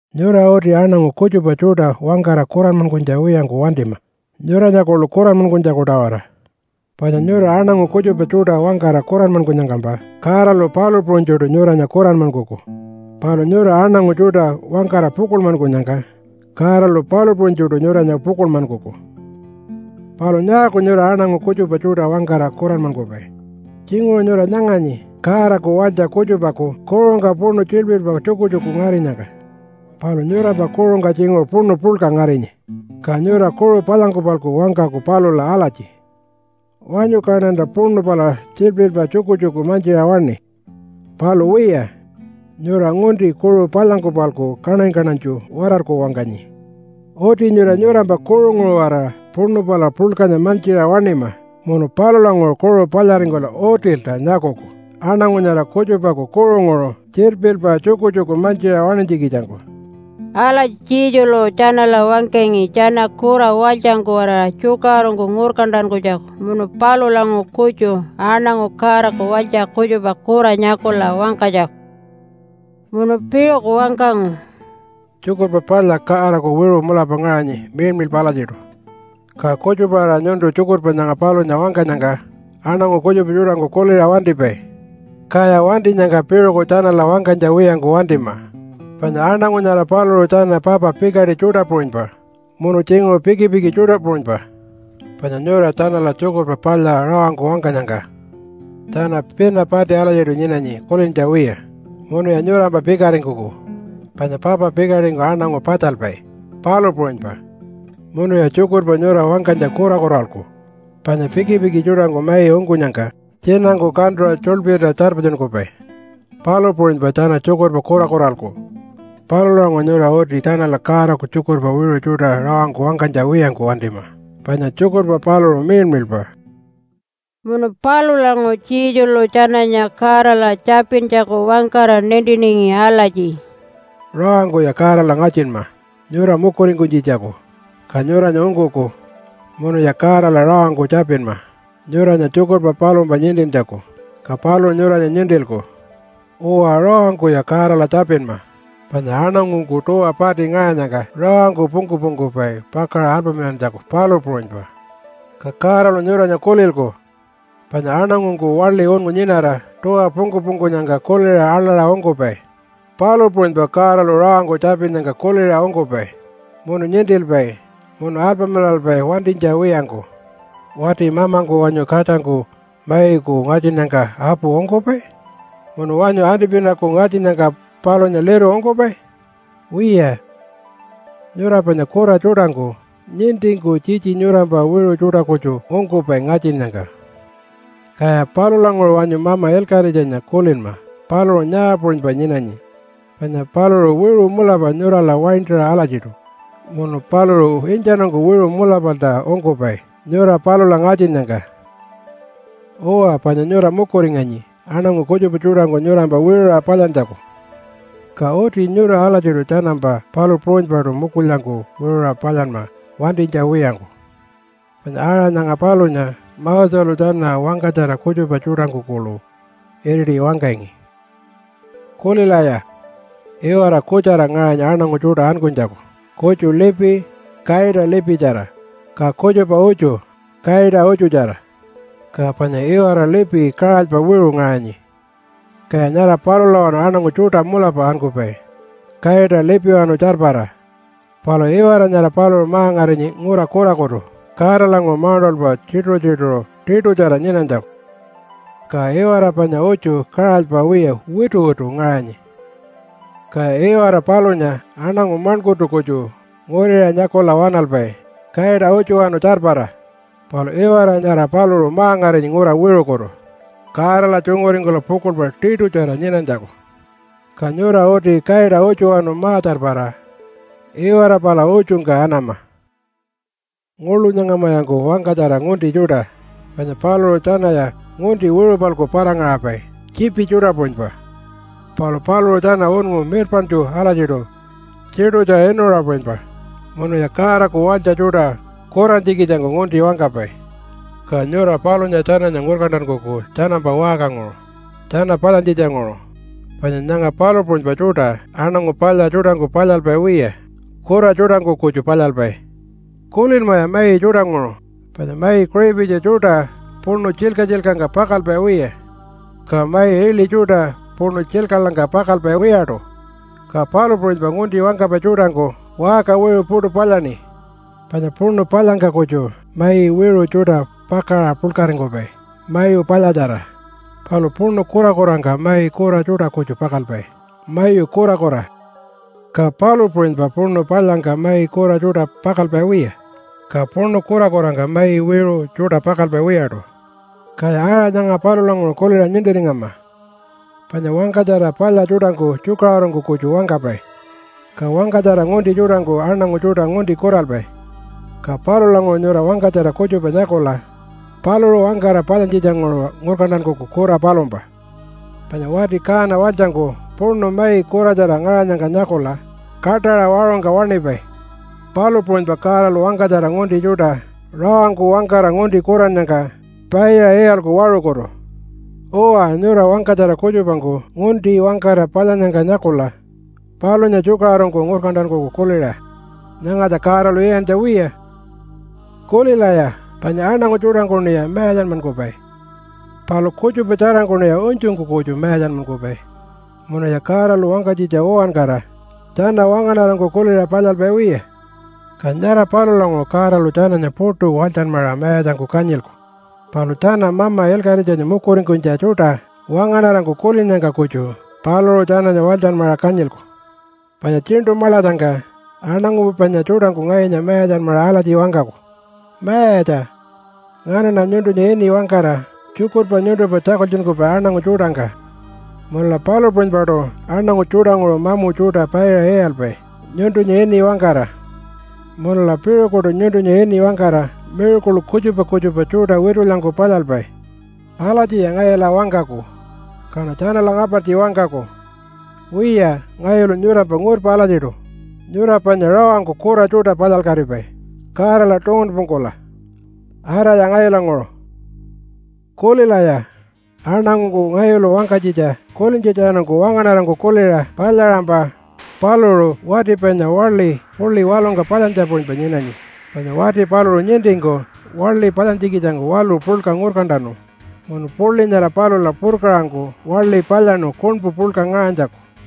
“Nyura uti aṉangu kutjupa tjuṯa wangkara kuranmankunytja wiyangku wantima nyuranya kuḻu kuranmankunytjaku-tawara. Panya nyura aṉangu kutjupa tjuṯa wangkara kuranmankunyangkampa Godalu palu puṟunytjuṯu nyuranya kuranmankuku. Palu nyura aṉangu tjuṯa wangkara pukuḻmankunyangka Godalu palu puṟunytjuṯu nyuranya pukuḻmankuku. “Palu nyaaku nyura aṉangu kutjupa tjuṯa wangkara kuranmankupai? Tjinguṟu nyura nyanganyi Godaku walytja kutjupaku kuṟungka puṉu tjilpirpa tjukutjuku ngarinyangka. Palu nyurampa kuṟungka tjinguṟu puṉu puḻka ngarinyi. Ka nyura kuṟu palyangku-palku wangkaku palula alatji, ‘Wanyu kaṉanta puṉu pala tjilpirpa tjukutjuku mantjiṟa waṉi.’ Palu wiya, nyura ngunti kuṟu palyangku-palku kaṉany-kaṉanytju watarku wangkanyi. Uti nyura nyurampa kuṟunguṟu-waraṟa puṉu pala puḻkanya mantjiṟa waṉima munu palulanguṟu kuṟu palyaringkula utilta nyakuku aṉangu nyara kutjupaku kuṟunguṟu tjilpirpa tjukutjuku mantjiṟa waṉinytjikitjangku.” Alatji Jesulu tjanala wangkangi tjana kura walytjangku-waraṟa tjukaṟurungku ngurkantankunytjaku munu palulanguṟu kutju aṉangu Godaku walytja kutjupa kura nyakula wangkanytjaku. Munu piṟuku wangkangu, “Tjukurpa Palya Godaku wiṟu mulapa ngaṟanyi miḻmiḻpa alatjiṯu. Ka kutjupa-aṟa nyuntu tjukurpa nyanga palunya wangkanyangka aṉangu kutjupa tjuṯangku kuliṟa wantipai. Kaya wantinyangka piṟuku tjanala wangkanytja wiyangku wantima. Panya aṉangu nyara paluṟu tjana papa pikaṯi tjuṯa puṟunypa munu tjinguṟu pikipiki tjuṯa puṟunypa. Panya nyura tjanala Tjukurpa Palya rawangku wangkanyangka tjana pina pati alatjiṯu nyinanyi kulintja wiya munuya nyurampa pikaringkuku, panya papa pikaṯingku aṉangu patjalpai, palu puṟunypa. Munuya tjukurpa nyura wangkanytja kurakuralku, panya pikipiki tjuṯangku mai ungkunyangka tjinangku kantuṟa tjuḻpirta tjarpatjunkupai, palu puṟunypa tjana tjukurpa kurakuralku. Palulanguṟu nyura uti tjanala Godaku tjukurpa wiṟu tjuṯa rawangku wangkanytja wiyangku wantima, panya tjukurpa paluṟu miḻmiḻpa.” Munu palulanguṟu Jesulu tjananya Godala tjapintjaku wangkara nintiningi alatji, “Rawangkuya Godala ngatjinma nyura mukuringkunytjitjaku, ka nyuranya ungkuku. Munuya Godala rawangku tjapinma nyuranya tjukurpa palumpa nintintjaku, ka paluṟu nyuranya nintilku. Uwa, rawangkuya Godala tjapinma, panya aṉangungku tuwa pati ngaṟanyangka rawangku pungku-pungkupai pakaṟa alpamilantjaku, palu puṟunypa. Ka Godalu nyuranya kulilku, panya aṉangungku waḻi unngu nyinara tuwa pungku-pungkunyangka kuliṟa aḻaṟa ungkupai, palu puṟunypa Godalu rawangku tjapinnyangka kuliṟa ungkupai munu nintilpai munu alpamilalpai wantinytja wiyangku. “Wati mamangku wanyu katjangku maiku ngatjinnyangka apu ungkupai? Munu wanyu antipinaku ngatjinnyangka palunya liru ungkupai? Wiya, nyura panya kura tjuṯangku nintingku tjitji nyurampa wiṟu tjuṯa kutju ungkupai ngatjinnyangka. Kaya palulanguṟu wanyu Mama Ilkaṟitjanya kulinma, paluṟu nyaa puṟunypa nyinanyi? Panya paluṟu wiṟu mulapa nyurala waintaṟa alatjiṯu, munu paluṟu intjanungku wiṟu mulapalta ungkupai nyura palula ngatjinnyangka. “Uwa, panya nyura mukuringanyi aṉangu kutjupa tjuṯangku nyurampa wiṟuṟa palyantjaku. Ka uti nyura alatjiṯu tjanampa palu puṟunypaṯu mukulyangku wiṟuṟa palyanma wantinytja wiyangku. Panya aṟa nyanga palunya Moselu tjana wangkatjara kutjupa tjuṯangku kuḻu iriṯi wangkangi. “Kulilaya! Iwara kutjara ngaṟanyi aṉangu tjuṯa ankunytjaku. Kutju lipi kaita lipitjara, ka kutjupa utju kaita utjutjara. Ka panya iwara lipi kaṟalypa wiṟu ngaṟanyi, kaya nyara palulawanu aṉangu tjuṯa mulapa ankupai kaita lipiwanu tjarpara. Palu iwara nyara paluṟu ma-ngarinyi ngura kurakutu Godalanguṟu mauṉṯalpa tjituṟu-tjituṟu tiṯutjara nyinanytjaku. Ka iwara panya utju kaṟalypa wiya wituwitu ngaṟanyi, kaya iwara palunya aṉangu maṉkurtu kutju nguriṟa nyakula waṉalpai kaita utjuwanu tjarpara. Palu iwara nyara paluṟu ma-ngarinyi ngura wiṟukutu Godala tjunguringkula pukuḻpa tiṯutjara nyinanytjaku. Ka nyura uti kaita utjuwanu ma-tjarpara iwara pala utjungka anama. “Nguḻu nyangamayanku wangkatjara ngunti tjuṯa, panya paluṟu tjanaya ngunti wiṟu-palku para-ngaṟapai tjiipi tjuṯa puṟunypa. Palu paluṟu tjana unngu mirpaṉtju alatjiṯu tjiṯutja inuṟa puṟunypa, munuya Godaku walytja tjuṯa kurantjikitjangku ngunti wangkapai. Ka nyura palunya tjananya ngurkantankuku tjanampa waṟkanguṟu, tjana palyantjitjanguṟu, panya nyanga palu puṟunypa tjuṯa aṉangu palya tjuṯangku palyalpai wiya, kura tjuṯangku kutju palyalpai. Kulinmaya mai tjuṯanguṟu, panya mai kiṟipitji tjuṯa puṉu tjilka-tjilkangka pakalpai wiya, ka mai iḻi tjuṯa puṉu tjilkaḻangka pakalpai wiyaṯu. Ka palu puṟunypa ngunti wangkapai tjuṯangku waṟka wiṟu puṯu palyaṉi. Panya puṉu palyangka kutju mai wiṟu tjuṯa pakaṟa puḻkaringkupai mayu palyatjara, palu puṉu kurakurangka mai kura tjuṯa kutju pakalpai mayu kurakura. Ka palu puṟunypa puṉu palyangka mai kura tjuṯa pakalpai wiya, ka puṉu kurakurangka mai wiṟu tjuṯa pakalpai wiyaṯu. Kaya aṟa nyanga palulanguṟu kuliṟa nintiringama panya wangkatjara palya tjuṯangku tjukaṟurungku kutju wangkapai, ka wangkatjara ngunti tjuṯangku aṉangu tjuṯa ngunti kuralpai. Ka palulanguṟu nyura wangkatjara kutjupa nyakula paluṟu wangkara palyantjitjanguṟu ngurkantankuku kura palumpa. Panya wati kaana walytjangku puṉu mai kuratjara ngaṟanyangka nyakula kaṯaṟa waṟungka waṉipai, palu puṟunypa Godalu wangkatjara ngunti tjuṯa rawangku wangkara ngunti kurannyangka paiṟa iyalku waṟukutu. Uwa, nyura wangkatjara kutjupangku ngunti wangkara palyannyangka nyakula palunya tjukaṟurungku ngurkantankuku kuliṟa, ‘Nyangatja Godalu iyantja wiya.’ “Kulilaya! Panya aṉangu tjuṯangkuṉiya mayatjanmankupai. Palu kutjupa tjarangkuṉiya unytjungku kutju mayatjanmankupai munuya Godalu wangkanytjitja uwankara tjana wangaṉarangku kuliṟa palyalpai wiya. Ka nyara palulanguṟu Godalu tjananya puṯu walytjanmaṟa mayatjangku kanyilku. Palu tjana Mama Ilkaṟitjanya mukuringkunytja tjuṯa wangaṉarangku kulinnyangka kutju paluṟu tjananya walytjanmaṟa kanyilku. Panya tjiṉṯu maḻatjangka aṉangu panya tjuṯangku ngayunya mayatjanmaṟa alatji wangkaku, ‘Mayatja! Nganaṉa nyuntunya ini wangkara tjukurpa nyuntumpa tjakultjunkupai aṉangu tjuṯangka, munula palu puṟunypaṯu aṉangu tjuṯanguṟu mamu tjuṯa paiṟa iyalpai nyuntunya ini wangkara, munula piṟukuṯu nyuntunya ini wangkara miracle kutjupa kutjupa tjuṯa witulyangku palyalpai.’ Alatjiya ngayula wangkaku kaṉa tjanala ngapartji wangkaku, ‘Wiya, ngayulu nyurampa ngurpa alatjiṯu. Nyura panya rawangku kura tjuṯa palyalkatipai Godala tungunpungkula. Araya ngayulanguṟu!’ “Kulilaya! Aṉangungku ngayulu wangkanytjitja kulintjatjanungku wangaṉarangku kuliṟa palyaṟampa paluṟu wati panya waḻi puḻi waḻungka palyantjanya puṟunypa nyinanyi. Panya wati paluṟu nintingku waḻi palyantjikitjangku waḻu puḻka ngurkantanu munu puḻi nyara palula purkaṟangku waḻi palyaṉu kuṉpu puḻka ngaṟanytjaku.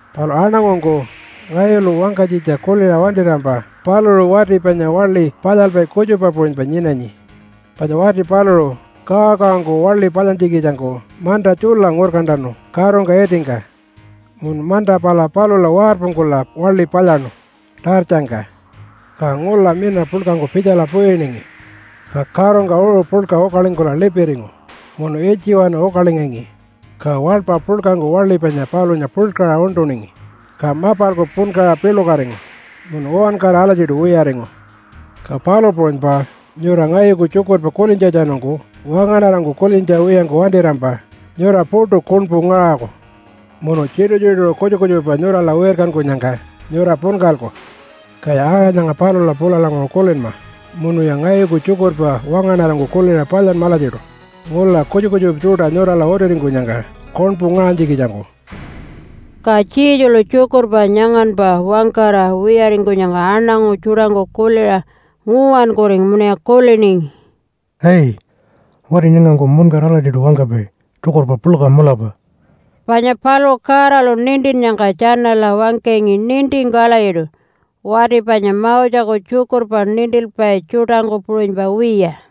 “Palu aṉangungku ngayulu wangkanytjitja kuliṟa wantirampa paluṟu wati panya waḻi palyalpai kutjupa puṟunypa nyinanyi, panya wati paluṟu kawakawangku waḻi palyantjikitjangku manta tjula ngurkantanu karungka itingka munu manta pala palula warpungkula waḻi palyaṉu tartjangka. Ka ngula mina puḻkangku pitjala puyiningi, ka karungka uṟu puḻka ukalingkula lipiringu munu ilytjiwanu ukalingangi. Ka waḻpa puḻkangku waḻi panya palunya puḻkaṟa uṉṯuningi, ka mapalku punkaṟa piḻukatingu munu uwankara alatjiṯu wiyaringu. Ka palu puṟunypa nyura ngayuku tjukurpa kulintjatjanungku wangaṉarangku kulintja wiyangku wantirampa nyura puṯu kuṉpu ngaṟaku munu tjituṟu-tjituṟu kutjupa kutjupa nyurala wirkankunyangka nyura punkalku. Kaya aṟa nyanga palula pulalanguṟu kulinma munuya ngayuku tjukurpa wangaṉarangku kuliṟa palyanma alatjiṯu ngula kutjupa kutjupa tjuṯa nyurala utiringkunyangka kuṉpu ngaṟanytjikitjangku.” Ka Jesulu tjukurpa nyanganpa wangkara wiyaringkunyangka aṉangu tjuṯangku kuliṟa nguwankuringu munuya kuliningi, “Ai, wati nyangangku muṉkara alatjiṯu wangkapai tjukurpa puḻka mulapa.” Panya paluṟu Godalu nintinnyangka tjanala wangkangi nintingku alatjiṯu, wati panya Moseku tjukurpa nintilpai tjuṯangku puṟunypa wiya.